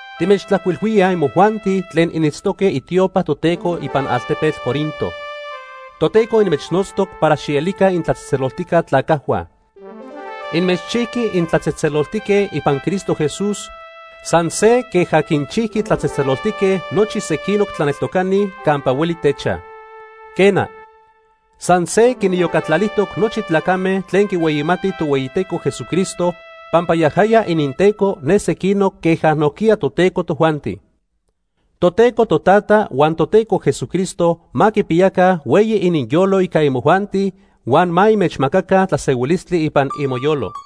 timechtlajcuilhuíaj imojuanti tlen initztoque itiopa Toteco ipan altepetl Corinto. Toteco inmechnotztoc para xielica itlatzejtzeloltijca tlacajhua. Inmechchijqui intlatzejtzeloltique ipan Cristo Jesús san se queja quinchijqui tlatzejtzeloltique nochi sequinoc tlaneltocani campa hueli techaj. Quena, san se quiniyocatlalijtoc nochi tlacame tlen quihueyimatij Tohueyiteco Jesucristo, pampa yajaya ininTeco ne sequinoc queja nojquiya toTeco tojuanti. Toteco Totata huan Toteco Jesucristo ma quipiyaca hueyi ininyolo ica imojuanti huan ma inmechmacaca tlasehuilistli ipan imoyolo.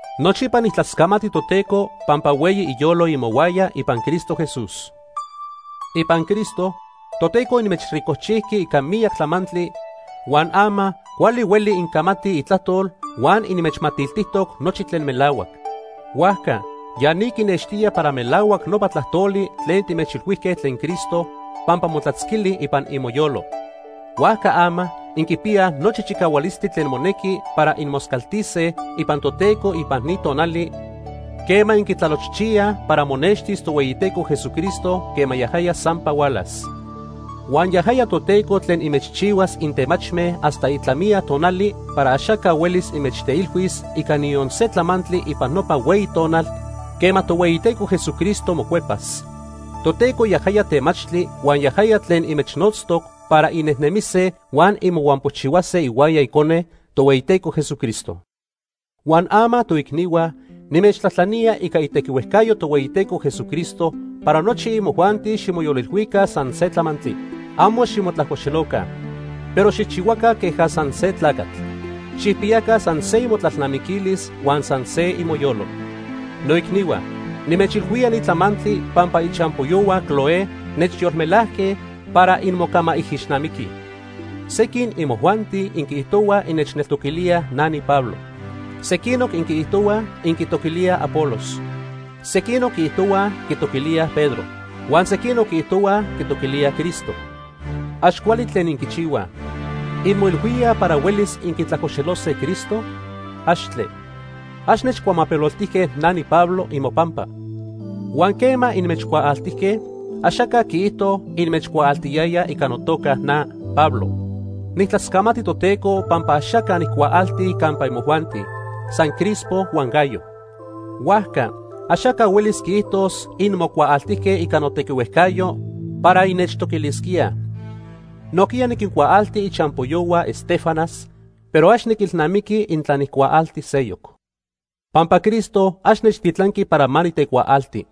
Nochipa nijtlascamati Toteco pampa hueyi iyolo imohuaya ipan Cristo Jesús. Ipan Cristo, Toteco inmechricojchijqui ica miyac tlamantli huan ama cuali huelij incamatij itlajtol huan inmechmatiltijtoc nochi tlen melahuac. Huajca ya ni quinextía para melahuac nopa tlajtoli tlen timechilhuijque tlen Cristo, pampa motlatzquili ipan imoyolo. Huajca ama inquipiyaj nochi chicahualistli tlen monequi para inmoscaltise ipan Toteco ipan ni tonali quema inquitlalochchiyaj para monextis Tohueyiteco Jesucristo quema yajaya sampa hualas. Huan yajaya Toteco tlen inmechchihuas intemachme hasta itlamiya tonali para axaca huelis inmechteilhuis ica niyon se tlamantli ipan nopa hueyi tonal quema Tohueyiteco Jesucristo mocuepas. Toteco yajaya temachtli huan yajaya tlen inmechnotztoc para innejnemise huan inmohuampochihuase ihuaya Icone, Tohueyiteco Jesucristo. Huan ama, toicnihua, nimechtlajtlanía ica itequihuejcayo Tohueyiteco Jesucristo para nochi imojuanti ximoyolilhuica san se tlamantli. Amo ximotlajcoxeloca, pero xijchihuaca queja san se tlacatl. Xijpiyaca san se imotlalnamiquilis huan san se imoyolo. Noicnihua, nimechilhuía ni tlamantli pampa ichampoyohua Cloé nechyolmelajque para inmocamaijixnamiquij. Sequin imojuanti inquiijtohuaj innechtoquilíaj na niPablo. Sequinoc inquiijtohuaj inquitoquilíaj Apolos. Sequinoc quiijtohuaj quitoquilíaj Pedro. Huan sequinoc quiijtohuaj quitoquilíaj Cristo. Ax cuali tlen inquichihuaj. ¿Inmoilhuíaj para huelis inquitlajcoxelose Cristo? ¡Axtle! Ax nechcuamapeloltijque na niPablo imopampa. Huan quema inmechcuaaltijque, axaca quiijto inmechcuaaltiyayaj ica notoca na Pablo. Nijtlascamati Toteco pampa axaca nijcuaalti campa imojuanti, san Crispo huan Gayo. Huajca axaca huelis quiijtos inmocuaaltijque ica notequihuejcayo para innechtoquilisquíaj. Nojquiya niquincuaalti ichampoyohua Estéfanas, pero ax niquilnamiqui intla nijcuaalti seyoc. Pampa Cristo ax nechtitlanqui para ma nitecuaalti.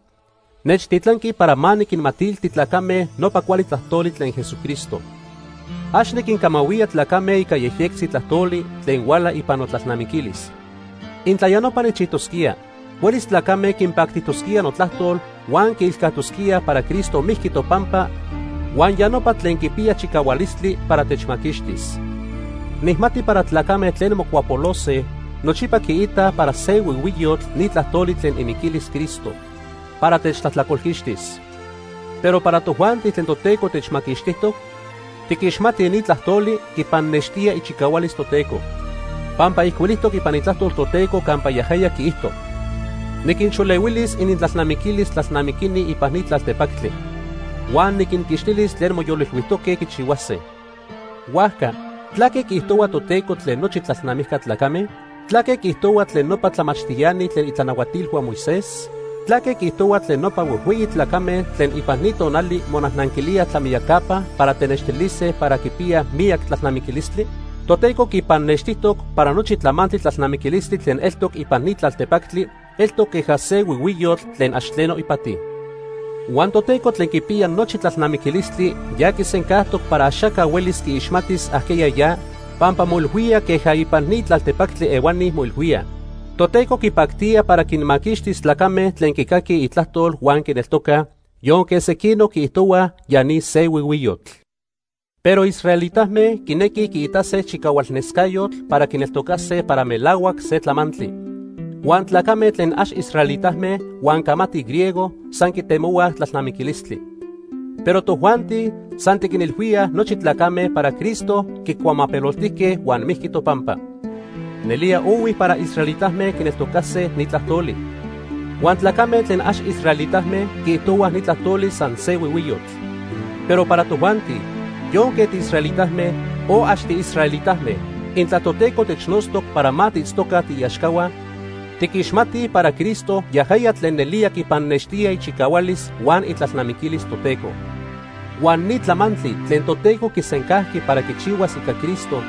Nechtitlanqui para ma niquinmatilti tlacame nopa cuali tlajtoli tlen Jesucristo. Ax niquincamahuía tlacame ica yejyectzi tlajtoli tlen huala ipan notlalnamiquilis. Intla ya nopa nijchijtosquía, huelis tlacame quinpactijtosquía notlajtol huan quiilcajtosquíaj para Cristo mijqui topampa huan ya nopa tlen quipiya chicahualistli para techmaquixtis. Nijmati para tlacame tlen mocuapolose nochipa quiitaj para se huihuiyotl ni tlajtoli tlen imiquilis Cristo para techtlajtlacolquixtis. Pero para tojuanti tlen Toteco techmaquixtijtoc, tiquixmatij ni tlajtoli quipannextía ichicahualis Toteco. Pampa ijcuilijtoc ipan Itlajtol Toteco campa yajaya quiijto: “Niquinxolehuilis inintlalnamiquilis tlalnamiquini ipan ni tlaltepactli. Huan niquinquixtilis tlen moyolilhuijtoque quichihuase.” Huajca ¿tlaque quiijtohua Toteco tlen nochi tlalnamijca tlacame? ¿Tlaque quiijtohua tlen nopa tlamachtiani tlen itlanahuatilhua Moisés? ¿Tlaque quiijtohua tlen nopa huejhueyi tlacame tlen ipan ni tonali monajnanquilíaj tlamiyacapa para tenextilise para quipiyaj miyac tlalnamiquilistli? Toteco quipannextijtoc para nochi tlamantli tlalnamiquilistli tlen eltoc ipan ni tlaltepactli eltoc queja se huihuiyotl tlen ax tleno ipati. Huan Toteco tlen quipiya nochi tlalnamiquilistli ya quisencajtoc para axaca huelis quiixmatis ajqueya ya pampa moilhuía queja ipan ni tlaltepactli ehuani moilhuíaj. Toteco quipactía para quinmaquixtis tlacame tlen quicaquij itlajtol huan quineltocaj, yonque sequinoc quiijtohuaj ya ni se huihuiyotl. Pero israelitame quinequij quiitase chicahualnescayotl para quineltocase para melahuac se tlamantli. Huan tlacame tlen ax israelitame huan camatij griego san quitemohuaj tlalnamiquilistli. Pero tojuanti san tiquinilhuíaj nochi tlacame para Cristo quicuamapeloltijque huan mijqui topampa. Nelía ohui para israelitame quineltocase ni tlajtoli. Huan tlacame tlen ax israelitame quiijtohuaj ni tlajtoli san se huihuiyotl. Pero para tojuanti, yonque tiisraelitame, o ax tiisraelitame, intla Toteco technotztoc para ma tiitztoca tiiaxcahua, tiquixmatij para Cristo yajaya tlen nelía quipannextía ichicahualis huan itlalnamiquilis Toteco. Huan ni tlamantli tlen Toteco quisencajqui para quichihuas ica Cristo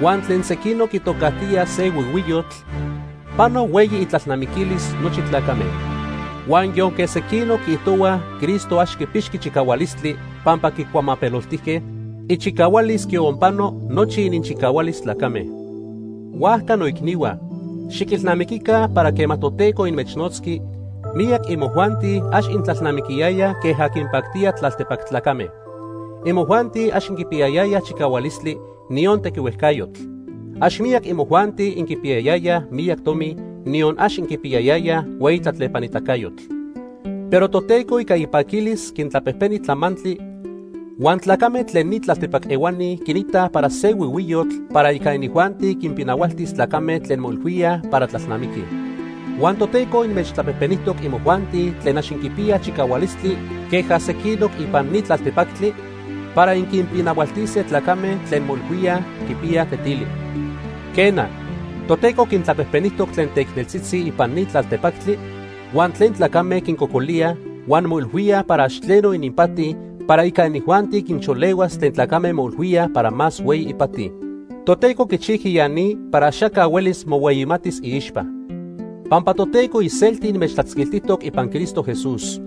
huan tlen sequinoc quitocajtíaj se huihuiyotl, pano hueyi itlalnamiquilis nochi tlacame. Huan yonque sequinoc quiijtohuaj Cristo ax quipixqui chicahualistli pampa quicuamapeloltijque, ichicahualis quionpano nochi ininchicahualis tlacame. Huajca noicnihua, xiquilnamiquica para quema Toteco inmechnotzqui, miyac imojuanti ax intlalnamiquiyayaj queja quinpactía tlaltepac tlacame. Imojuanti ax inquipiyayayaj chicahualistli, niyon tequihuejcayotl. Ax miyac imojuanti inquipiyayayaj miyac tomi, niyon ax inquipiyayayaj hueyi tlatlepanitacayotl. Pero Toteco ica ipaquilis quintlapejpeni tlamantli huan tlacame tlen ni tlaltepac ehuani quinitaj para se huihuiyotl para ica inijuanti quinpinahualtis tlacame tlen moilhuíaj para tlalnamiquij. Huan Toteco inmechtlapejpenijtoc imojuanti tlen ax inquipiyaj chicahualistli queja sequinoc ipan ni tlaltepactli, para inquinpinahualtise tlacame tlen moilhuíaj quipiyaj tetili. Quena, Toteco quintlapejpenijtoc tlen teicneltzitzi ipan ni tlaltepactli huan tlen tlacame quincocolíaj huan moilhuíaj para ax tleno ininpati para ica inijuanti quixolehuas tlen tlacame moilhuíaj para más hueyi ipati. Toteco quichijqui ya ni para axaca huelis mohueyimatis iixpa. Pampa Toteco iselti inmechtlatzquiltijtoc ipan Cristo Jesús.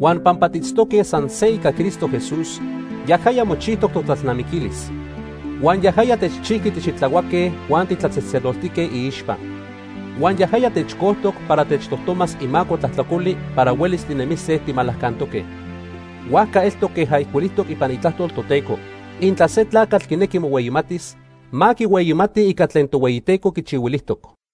Huan pampa tiitztoque san se ica Cristo Jesús, yajaya mochijtoc totlalnamiquilis. Huan yajaya techchijqui tixitlahuaque huan titlatzejtzeloltique iixpa. Huan yajaya techcojtoc para techtojtomas imaco tlajtlacoli para huelis tinemise timalacantoque. Huajca eltoc queja ijcuilijtoc ipan Itlajtol Toteco: “Intla se tlacatl quinequi mohueyimatis, ma quihueyimati ica tlen Tohueyiteco quichihuilijtoc.”